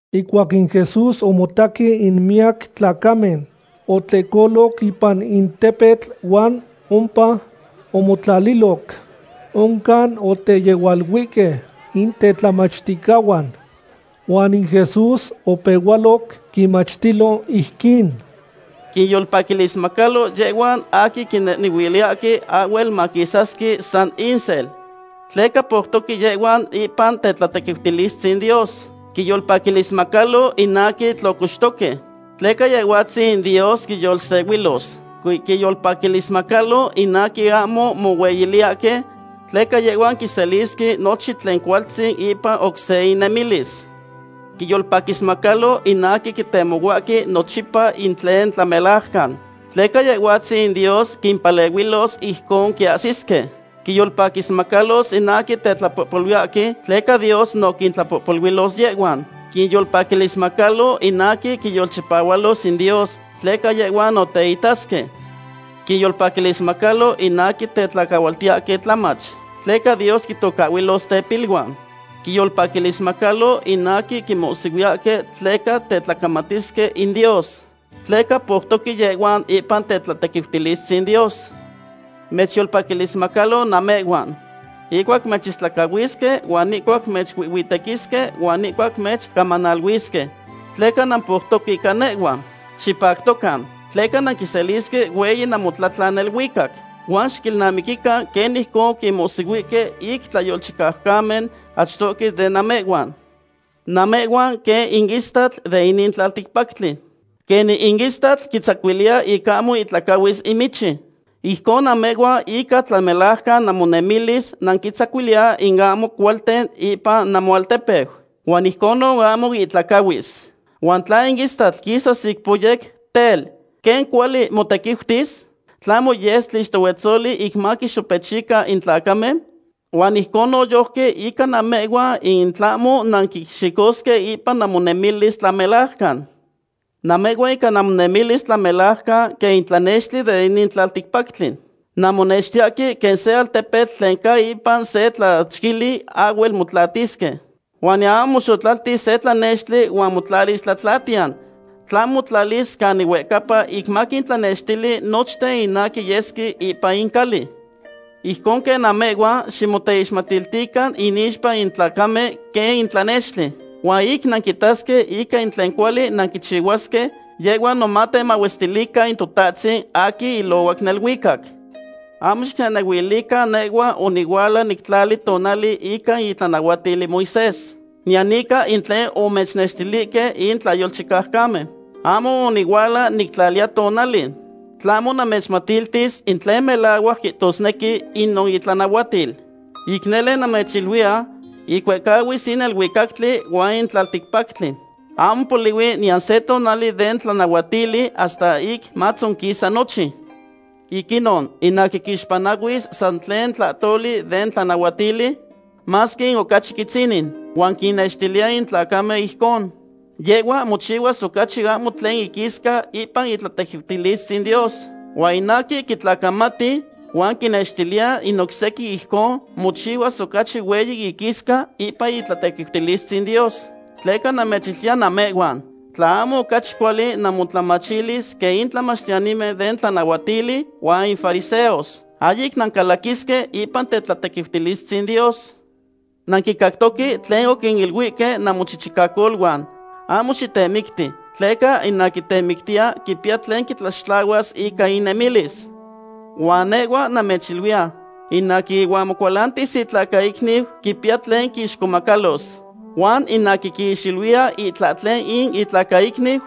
Ihcuac in Jesús omotaque in miyac tlacamen, otlehcoloc ipan in tepetl huan ompa omotlaliloc. Oncan oteyehualuihque in tetlamachticahuan. Huan in Jesús opehualoc quinmachtilo ijquin: ―Quinyolpaquilismacalo yehhuan aquin quinehnehuiliyahque ahhuel maquisasque san insel, tleca poutoque yehhuan ipan tetlatequiutilistzin in Dios. ’Quinyolpaquilismacalo in aquin tlocoxtoque, tleca Yehhuatzin in Dios quinyolsehuilos. ’Quinyolpaquilismacalo in aquin ahmo mohueyiliyahque, tleca yehhuan quiselisque nochin tlen cualtzin ipan oc se innemilis. ’Quinyolpaquilismacalo in aquin quitemohuahque nochipa in tlen tlamelajcan, tleca Yehhuatzin in Dios quimpalehuilos ijcon quiahsisque. ’Quinyolpaquilismacalo in aquin tetlapohpoluiyahque, tleca Dios no quintlapohpoluilos yehhuan. ’Quinyolpaquilismacalo in aquin quinyolchipahualos in Dios, tleca yehhuan no teitasque. ’Quinyolpaquilismacalo in aquin tetlacahualtiyahque tlamach, tleca Dios quintocahhuilos tepiluan. ’Quinyolpaquilismacalo in aquin quinmohsihuiyahque tleca tetlacamatisque in Dios, tleca poutoque yehhuan ipan in tetlatequiutilistzin Dios. ’Mechyolpaquilismacalo namehhuan, ihcuac mechistlacahuisque huan ihcuac mechuihhuitequisque huan ihcuac mechcamanaluisque, tleca nampoutoque ica nehhua. Xipactocan, tleca nanquiselisque hueyi namotlatlan neluicac. Huan xiquilnamiquican quen ijcon oquinmohsihuihque in tlayolchicaucamen achtohque de namehhuan. ’Namehhuan quen in istatl de inin tlalticpactli. Quenin in istatl quitzacuiliya ic ahmo ihtlacahuis in michi, ijcon namehhuan ica tlamelajcan namonemilis nanquintzacuiliya in ahmo cualten ipan namoaltepeu, huan ijcon ahmo ihtlacahuis. Huan tla in istatl quisas ic poyec, tel, ¿quen cuali motequiutis? ¿Tlahmo yes tlixtohuetzoli ic maquixopechican in tlacamen? Huan ijcon noyojqui ica namehhuan in tlahmo nanquixicosque ipan namonemilis tlamelajcan. ’Namehhuan ica namonemilis tlamelajcan quen in tlanextli de inin tlalticpactli. Nanmonextiyahque quen se altepetl tlen ca ipan se tlachquili ahhuel motlatisque. Huan niyan ahmo moxotlaltis se tlanextli huan motlalis tlatlatiyan, tlahmo motlalis canin huehcapa ic maquintlanextili nochten in aquin yesque ipan in cali. Ijcon quen namehhuan, ximoteixmatiltican inixpa in tlacamen quen in tlanextli, huan ic quitasque ica in tlen cuali nanquichihuahque, yehhuan no matemahuestilican in Totahtzin aquin ilohuac neluicac. ’Ahmo xicnehnehuilican nehhua onihuala nictlali tonali ica in itlanahuatil in Moisés, niyan ica in tlen omechnextilihque in tlayolchicaucamen. Ahmo onihuala nictlali tonali, tlahmo namechmatiltis in tlen melahuac quihtosnequi inon itlanahuatil. Ic nele namechiluiya, ic huehcahuis in neluicactli huan in tlalticpactli, ahmo polihui niyan se tlahtoli den tlanahuatili, hasta ic matzonquisa nochin. Ic inon, in aquin quixpanahuis san tlen tlahtoli den tlanahuatili, masque in ocachi quitzinin, huan quinnextiliya in tlacamen ijcon, yehhua mochihuas ocachi ahmo tlen iquisca ipan in tetlatequiutilistzin Dios. Huan in aquin quitlacamati, huan quinnextiliya in oc sequin ijcon, mochihuas ocachi hueyi iquisca ipan in tetlatequiutilistzin Dios. Tleca namechiluiya namehhuan, tla ahmo ocachi cuali namotlamachilis quen in tlamachtiyanimen den tlanahuatili huan in fariseos, ahyic nancalaquisque ipan in tetlatequiutilistzin Dios. ’Nanquicactoque tlen oquiniluihque in namochichicacoluan: “Ahmo xitemicti, tleca in aquin temictiya quipiya tlen quitlaxtlahuas ica inemilis.” Huan nehhua namechiluiya, in aquin ihuan mocualantis in itlacaicniu quipiya tlen quixcomacalos. Huan in aquin quixiluiya itlahtlen in itlacaicniu,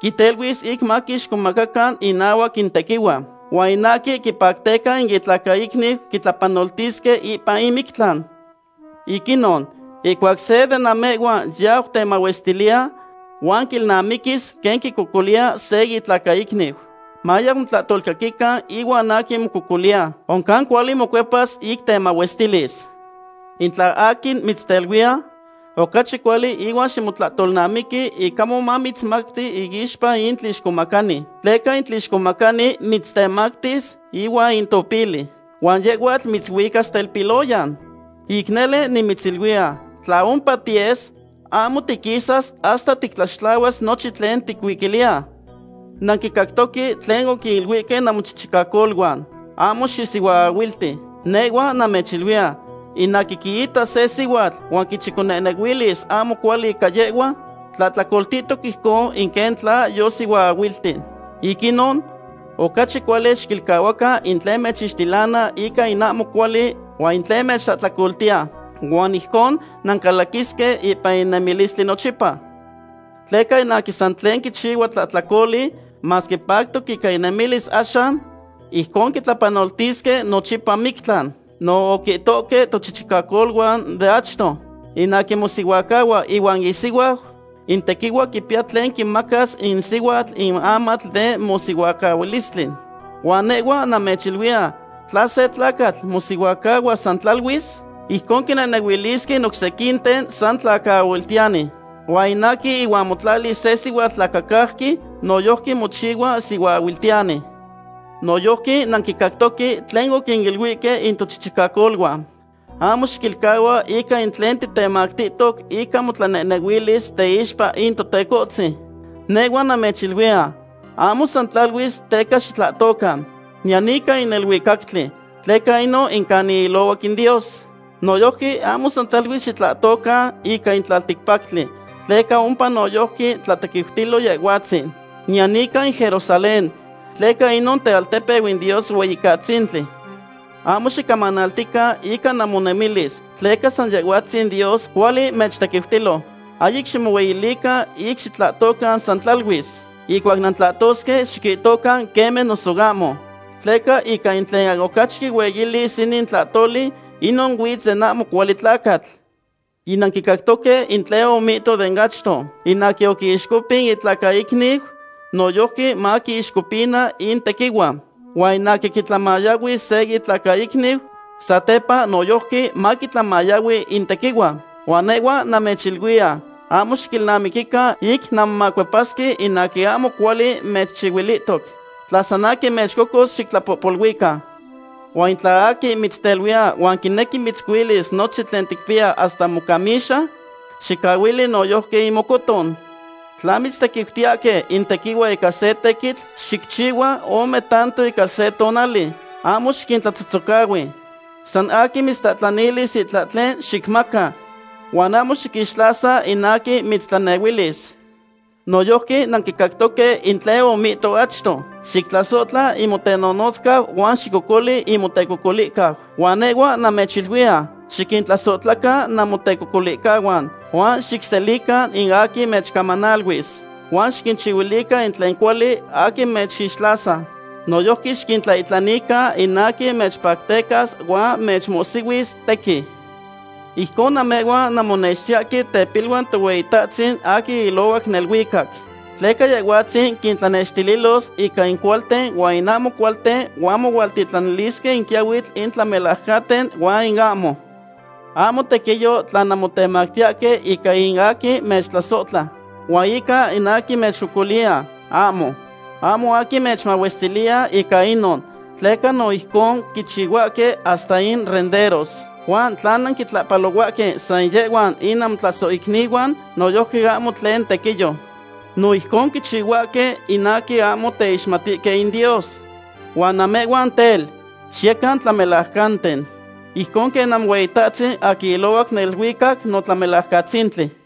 quiteluis ic maquixcomaca inahuac in tequihua. Huan in aquin quipacteca in itlacaicniu quitlapanoltisque ipan in mictlan. ’Ic inon, ihcuac seya de namehhuan yau temahuestiliya, huan quilnamiquis quen quicocoliya se itlacaicniu, mayau motlahtolcaquican ihuan aquin mococoliya. Oncan cuali mocuepas ic temahuestilis. ’In tla aquin mitzteluiya, ocachi cuali ihuan ximotlahtolnamiqui ic ahmo mamitztemacti iixpa in tlixcomacani, tleca in tlixcomacani mitztemactis ihuan in topili, huan yehhuatl mitzuicas telpiloyan. Ic nele nimitziluiya, tla ompa tiyes, ahmo tiquisas hasta tictlaxtlahuas nochin tlen ticuiquiliya. ’Nanquicactoque tlen oquiniluihque in namochichicacoluan: “Ahmo xisihuaahuilti.” Nehhua namechiluiya, in aquin quiita se sihuatl huan quichiconehnehuilis ahmo cuali ica yehhua, tlahtlacoltihtoc ijcon quen tla yosihuaahuilti. ’Ic inon, ocachi cuali xiquilcahuacan in tlen mechixtilana ica in ahmo cuali huan in tlen mechtlahtlacolanaltiya. Huan ijcon nancalaquisque ipan in nemilistli nochipa. Tleca in aquin san tlen quichihua tlahtlacoli, masque pactoc ica inemilis axan, ijcon quitlapanoltisque nochipa mictlan. ’No oquihtohque tochichicacoluan de achto: “In aquin mosihuacahua ihuan isihuau, in tequihua quipiya tlen quimacas in sihuatl in amatl den mosihuacahualistli.” Huan nehhua namechiluiya tla se tlacatl mosihuacahua san tlaluis, ijcon quinehnehuilisque in oc sequinten san tlacaahuiltiyani. Huan in aquin ihuan motlalis se sihuatl tlacacauqui, noyojqui mochihua sihuaahuiltiyani. ’Noyojqui nanquicactoque tlen oquiniluihque in tochichicacoluan: “Ahmo xiquilcahua ica in tlen titemactihtoc ica motlanehnehuilis teixpa in Totecohtzin.” Nehhua namechiluiya, ahmo san tlaluis teca xitlahtocan, niyan ica in neluicactli, tleca inon in canin ilohuac in Dios. Noyojqui ahmo san tlaluis xitlahtocan ica in tlalticpactli, tleca ompa noyojqui tlatequiutilo Yehhuatzin, niyan ica in Jerusalén, tleca inon tealtepeu in Dios Hueyicatzintli. Ahmo xicamanaltican ica namonemilis tleca san Yehhuatzin Dios cuali mechtequiutilo. Ahyic ximohueyilican ic xitlahtocan san tlaluis. Ihcuac nantlahtosque, xiquihtocan “queme” noso “ahmo”, tleca ica in tlen ocachi quihueyilis inin tlahtoli, inon huitz den ahmo cuali tlacatl. ’Yinanquicactoque in tlen omihto de achto: “In aquin oquiixcopin itlacaicniu, noyojqui maquiixcopina in tequihua. Huan in aquin quitlanmayahui se itlacaicniu, satepa noyojqui maquitlanmayahui in tequihua.” Huan nehhua namechiluiya, ahmo xiquilnamiquican ic nanmomacuepasque in aquin ahmo cuali mechchihuilihtoc. Tla san aquin mechcocos, xictlapohpoluican. Huan tla aquin mitzteluiya huan quinequi mitzcuilis nochin tlen ticpiya hasta mocamixa, xicahuili noyojqui in mocoton. Tla mitztequiutiyahque in tequihua ica se tequitl, xicchihua ome tanto ica se tonali. Ahmo xiquintlatzohtzocahui. San aquin mitztlahtlanilis itlahtlen, xicmaca, huan ahmo xiquixtlasa in aquin mitztlanehuilis. ’Noyojqui nanquicactoque in tlen omihto achto: “Xictlasohtla in motenonotzcau huan xicocoli in motecocolihcau.” Huan nehhua namechiluiya, xiquintlasohtlacan namotecocolihcahuan, huan xicselican in aquin mechcamanaliluis, huan xiquinchihuilican in tlen cuali in aquin mechixtlasa. Noyojqui xiquintlaihtlanican in aquin mechpactecas huan mechmohsihuis tequin. Ijcon namehhuan nanmonextiyahque tepiluan Tohueyitahtzin aquin ilohuac neluicac, tleca Yehhuatzin quintlanextililos ica in cualten huan in ahmo cualten huan mohualtitlanilisque in quiyahuitl in tlamelajcanten huan in ahmo. Ahmo tequiyo tla nanmotemachiyahque ica in aquin mechtlasohtla, huan ica in aquin mechcocoliya, ahmo. Ahmo aquin mechmahuestiliya ica inon, tleca no ijcon quichihuahque hasta in renderos. Huan tla nanquintlahpalohuahque san yehhuan in namotlasohicnihuan, noyojqui ahmo tlen tequiyo. No ijcon quichihuahque in aquin ahmo teixmatihque in Dios. Huan namehhuan tel, xiyecan tlamelajcanten, ijcon quen Namohueyitahtzin aquin ilohuac neluicac no Tlamelajcatzintli.